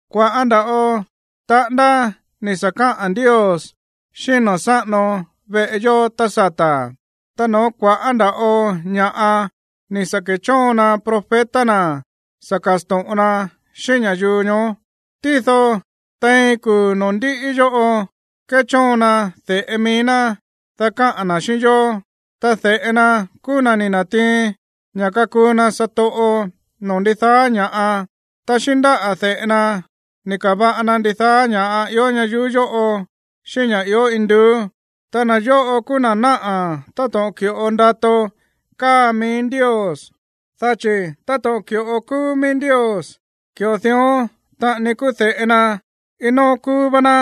Kua̱ꞌá nda̱ꞌo taꞌándá ni̱ sa̱ káꞌa̱n Ndios xíꞌín na̱ sáꞌano veꞌe yó tá sata̱, ta no̱ó kua̱ꞌá nda̱ꞌo ña̱ꞌa ni̱ sa̱ kechóon na profeta na̱ sa̱ kasto̱ꞌon na xíꞌín ña̱yuu ñoó. Tído tein kuu̱ noo̱ ndiꞌi yóꞌo kéchóon na de̱ꞌe mií ná, dá kaꞌa̱n na̱ xíꞌín yó, ta de̱ꞌe na kúú na̱ ni̱ na̱tiin ña̱ kakuu na satoꞌo noo̱ ndidaá ña̱ꞌa, ta xíꞌín ndáꞌa̱ de̱ꞌe na ni̱ ka̱va̱ꞌa na ndidaá ña̱ ió ñayuú yóꞌo xíꞌín ña̱ ió induú. Ta na̱ yóꞌo kúú na̱ náꞌa̱ táto̱ꞌon ki̱ꞌo ndato káa mií Ndios, dá chi̱ táto̱ꞌon ki̱ꞌo kúú mií Ndios, ki̱ꞌo dión taꞌani kúú de̱ꞌe na, iin nóó kúú vá ná.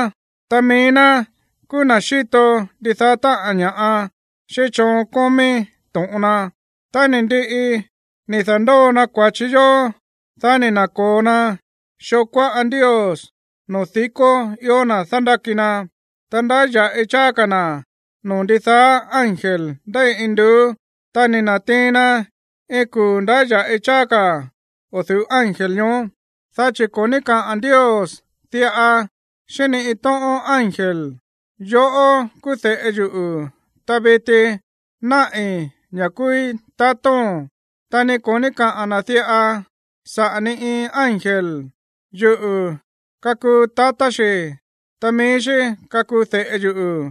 Ta mií ná kúú na̱ xíto ndidaá táꞌa̱n ña̱ꞌa xíꞌín choon kómí to̱ꞌon na. Tá ni̱ ndiꞌi ni̱ da̱ndóo na kua̱chi yó, dá ni̱ na̱ko̱o na xoo kuáꞌa Ndios noo̱ di̱kó ió na̱ dándáki na. Ta ndáya̱ꞌi cháá ka̱ na̱ noo̱ ndidaá ángel ndéi induú, ta ni̱ na̱tiin na iin kuu̱ ndáya̱ꞌi cháá ka̱ o̱ du̱ú ángel ñoó. Dá chi̱ ko̱ ní kaꞌa̱n Ndios diꞌa xíꞌín ni iin tóꞌón ángel: Yoꞌó kúú de̱ꞌe yuꞌu̱, ta viti náꞌi̱ ña̱ kúúí tatóo̱n. Ta ni ko̱ ní kaꞌa̱n na̱ diꞌa saꞌa̱ ni iin ángel: Yuꞌu̱ kakuu tatá xi̱, ta mií xí kakuu de̱ꞌe yuꞌu̱.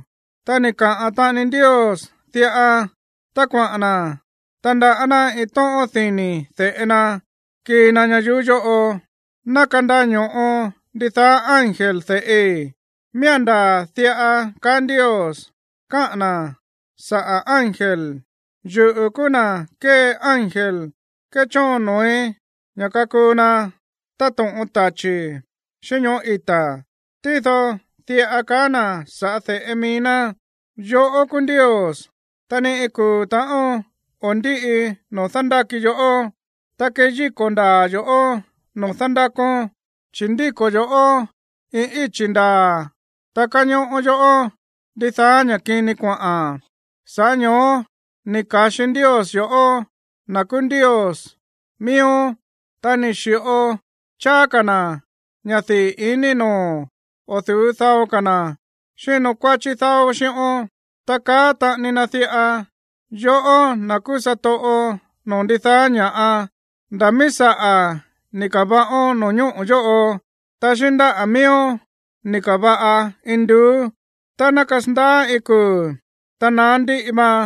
Ta ni̱ kaꞌa̱n taꞌani Ndios diꞌa tá kuaꞌa̱n na̱ tandaꞌá ná iin tóꞌón dini̱ de̱ꞌe na kii na ñayuú yóꞌo: Ná kandaño̱ꞌo ndidaá ángel de̱ꞌi. Miía̱n ndaa̱ diꞌa kaá Ndios káꞌa̱n na̱ saꞌa̱ ángel: Yuꞌu̱ kúú na̱ kée ángel kéchóon noo̱í ña̱ kakuu na táto̱ꞌon tachi̱, xíꞌín ñoꞌó ita̱. Tído diꞌa kaá na̱ sa̱ꞌá de̱ꞌe mií ná: Yoꞌó kúú Ndios, ta ni iin kuu̱ ta̱ꞌón o̱ ndíꞌi noo̱ dándáki yoꞌó. Ta kéyíko̱ ndaa̱ yo̱ꞌó noo̱ dándákón. Chi̱ ndíko̱ yo̱ꞌó iin íchi̱ ndaa̱, ta káñóꞌó yoꞌó ndidaá ña̱ kini kuaꞌa̱n. Sa̱ꞌá ño̱ó ni̱ ka̱xi Ndios yo̱ꞌó, na̱ kúú Ndios miíón, ta ni̱ xi̱ꞌo cháá ka̱ na̱ ña̱ dii̱ iní noo̱o̱n o̱ du̱ú dao ka̱ na̱ xínkuáchí dáó xíꞌón. Ta kaá taꞌani na diꞌa: Yoꞌó, na̱ kúú satoꞌo noo̱ ndidaá ña̱ꞌa, nda̱ míí saꞌa̱ ni̱ ka̱va̱ꞌón no̱ñóꞌo̱ yóꞌo, ta xíꞌín ndáꞌa̱ mííón ni̱ ka̱va̱ꞌa induú. Ta ná kasandaá iin kuu̱, ta naá ndíꞌi vaan,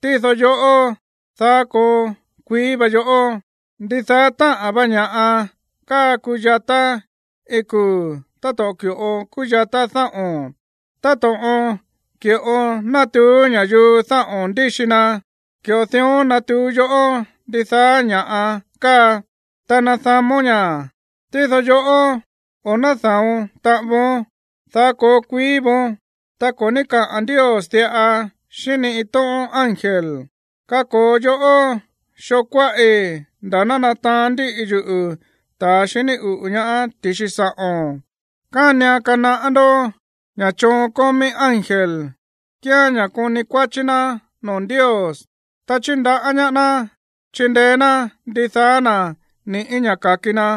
tído yoꞌó, daá koo kuií vá yoꞌó. Ndidaá táꞌa̱n va ña̱ꞌa káa kuyatá iin kuu̱ táto̱ꞌon ki̱ꞌo kúyatá dáꞌo̱n. Ta táto̱ꞌon ki̱ꞌo nátuú ña̱yuu dáꞌo̱n ndíxi na, ki̱ꞌo dión natuú yoꞌó ndidaá ña̱ꞌa káa, ta ná nada̱món ña̱. Tído yoꞌó, o̱ náda̱on taꞌan voón, daá koo kuií vóón. Ta ko̱ ní kaꞌa̱n Ndios diꞌa xíꞌín ni iin tóꞌón ángel: Kako̱o yoꞌó xoo kuáꞌi̱ nda̱ ná nataán ndíꞌi yuꞌu̱ ta̱ xiní uꞌu̱ ñaá ti̱xi sa̱ꞌo̱n. Kánian kanaꞌá ndó ña̱ choon kómí ángel kíán ña̱ koni kuáchí ná noo̱ Ndios, ta chíndaꞌá ñaá ná chindeé ná ndidaá na̱ ni̱ꞌí ña̱ ka̱ki na.